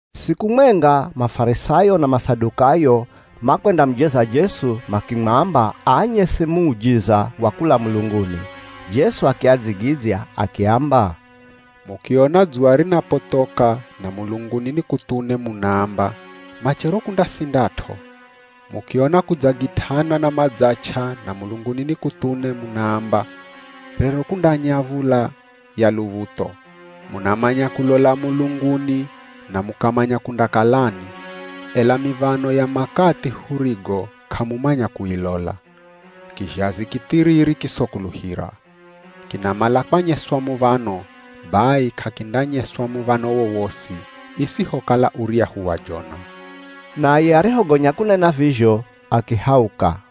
Siku mwenga Mafarisayo na Masadukayo makwendamujeza Jesu makimwamba aanyese muujiza wa kula mulunguni. Jesu akiadzigidzya akiamba, [“Mukiona dzuwa rinapothoka, na mulunguni ni kuthune, munaamba, ‘Machero kundasindat'o.’ Mukiona kudzagit'ana na madzach'a na mulunguni ni kuthune, munaamba ‘Rero kundanya v̱ula ya luv̱utho.’ Munamanya kulola mulunguni na mukamanya kundakalani, ela miv̱ano ya makathi hurigo k'amumanya kuilola?] Kizhazi kithiriri kisokuluhira! Kinamala kwanyeswa muv̱ano, bai k'akindanyeswa muv̱ano wowosi, isihokala uryahu wa Jona.” Naye arihogonya kunena vizho, akihauka.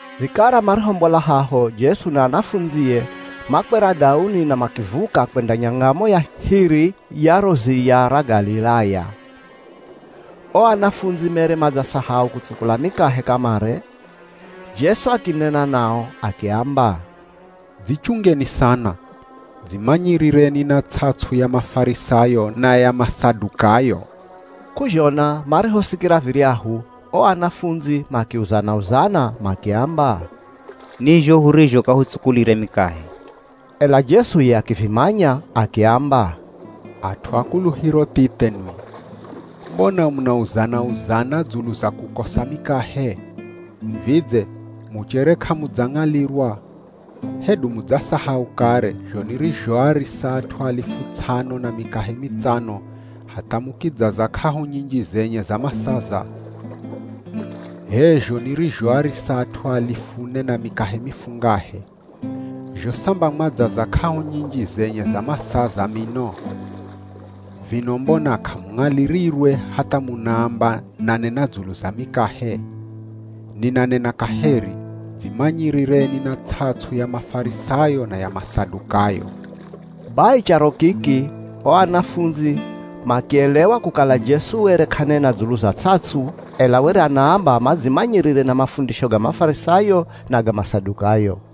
Vikara marihombola haho Jesu na anafundzie makwera dauni na makivuka kwenda nyangamo ya hiri ya ro ziya ra Galilaya. O anafundzi mere madzasahau kutsukula mikahe kamare. Jesu akinena nao akiamba, “Dzichungeni sana. Dzimanyirireni na ts'ats'u ya Mafarisayo na ya Masadukayo.” K'uzhona marihosikira viryahu, o anafundzi makiuzana-uzana makiamba, “Ni zho hurizho k'ahutsukulire mikahe.” Ela Jesu ye akivimanya, akiamba, “At'u a kuluhiro thithe nwi! Mbona munauzana-uzana dzulu za kukosa mikahe? Vidze muchere k'amudzang'alirwa? Hedu mudzasahau kare zho nirizhoarisa at'u alifu ts'ano na mikahe mitsano hatha mukidzaza k'ahu nyinji zenye za masaza? H'e zho nirizhoarisa at'u alifu ne na mikahe mifungahe. Zho samba mwadzaza k'ahu nyinji zenye za masaza mino! Vino mbona k'amung'alirirwe hatha munaamba nanena dzulu za mikahe? Ninanena kaheri, dzimanyirireni na ts'ats'u ya Mafarisayo na ya Masadukayo.” Bai charo kiki, o anafundzi makielewa kukala Jesu were k'anena dzulu za ts'ats'u, ela were anaamba madzimanyirire na mafundisho ga Mafarisayo na ga Masadukayo.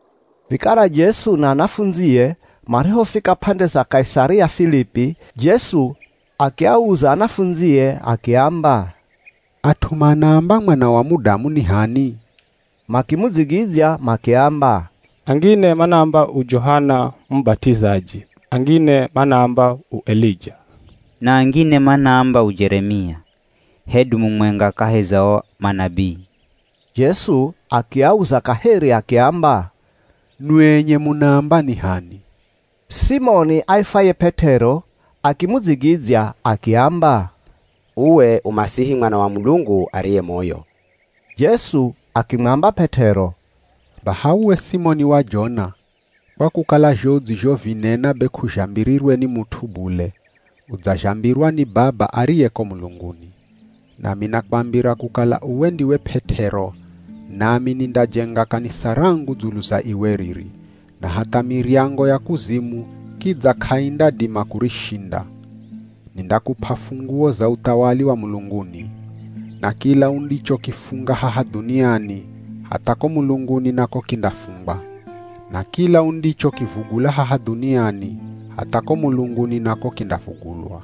Vikara Jesu na anafundzie marihofika p'ande za Kaisaria Filipi, Jesu akiauza anafundzie akiamba, “At'u manaamba Mwana wa Mudamu ni h'ani?” Makimudzigidzya makiamba, “Angine manaamba u Johana Mubat'izaji, angine manaamba u Elija, na angine manaamba u Jeremia, hedu mumwenga kahi za o manabii.” Jesu akiauza kaheri akiamba, “Nwi enye munaamba ni h'ani?” Simoni aifwaye P'et'ero akimudzigidzya akiamba, “Uwe u Masihi Mwana wa Mulungu ariye moyo.” Jesu akimwamba P'et'ero, “Baha uwe Simoni wa Jona, kwa kukala zho udzizhovinena be k'uzhambirirwe ni mut'u bule, udzazhambirwa ni Baba ariye ko mulunguni. Nami nakwambira kukala uwe ndiwe P'et'ero, nami nindajenga kanisa rangu dzulu za iwe riri, na hatha miryango ya kuzimu kidza k'aindadima kurishinda. Nindakup'a funguo za uthawali wa mulunguni. Na kila undichokifunga haha dhuniani, hatha ko mulunguni nako kindafungwa. Na kila undichokivugula haha dhuniani, hatha ko mulunguni nako kindavugulwa.”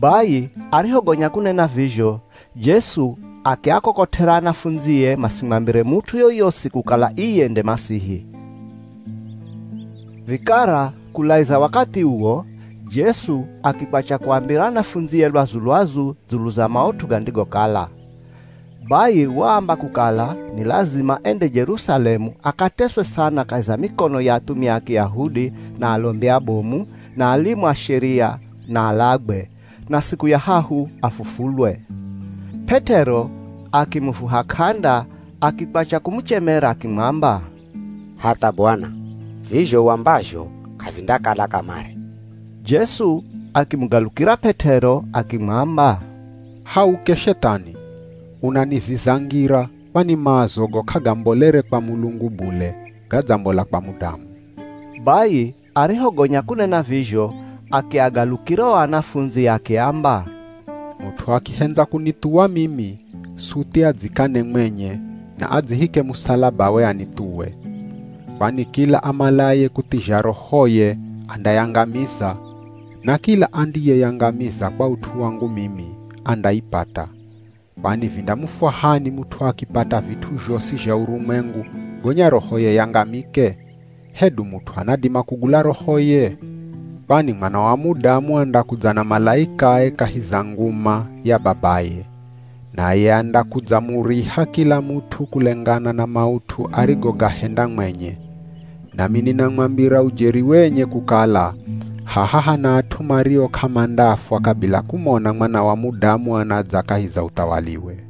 Bai arihogonya kunena vizho, Jesu akiakokot'era anafundzie masimwambire mut'u yoyosi kukala iye nde Masihi. Vikara kulaiza wakathi uwo, Jesu akikwacha kuambira anafundzie lwazu-lwazu dzulu za maut'u gandigokala. Bai waamba kukala, ni lazima ende Jerusalemu akateswe sana kahi za mikono ya athumia a Kiyahudi, na alombi abomu, na alimu a Sheria, na alagwe, na siku ya hahu afufulwe. P'et'ero akimuvuha k'anda akikwacha kumuchemera akimwamba, “Hatha Bwana, vizho uambazho k'avindakala kamare.” Jesu akimugalukira P'et'ero akimwamba, “Hauke Shethani, unaniziza ngira, kwani maazogo k'agambolere kwa Mulungu bule, gadzambola kwa mudamu.” Bai arihogonya kunena vizho akiagalukira o anafundzi akiamba, “Mut'u akihendza kunithuwa mimi, suthi adzikane mwenye, na adzihike musalabawe anithuwe. Kwani kila amalaye kuthizha rohoye andayangamiza, na kila andiyeyangamiza kwa ut'u wangu mimi andaipata. Kwani vindamufwahani mut'u akipata vit'u zhosi zha urumwengu, gonya rohoye yangamike? Hedu mut'u anadima kugula rohoye? Kwani Mwana wa Mudamu andakudza na malaikae kahi za nguma ya Babaye, naye andakudzamuriha kila mut'u kulengana na maut'u arigogahenda mwenye. Nami ninamwambira ujeri wenye kukala haha hana at'u mario k'amandafwa kabila kumona Mwana wa Mudamu anadza kahi za uthawaliwe.”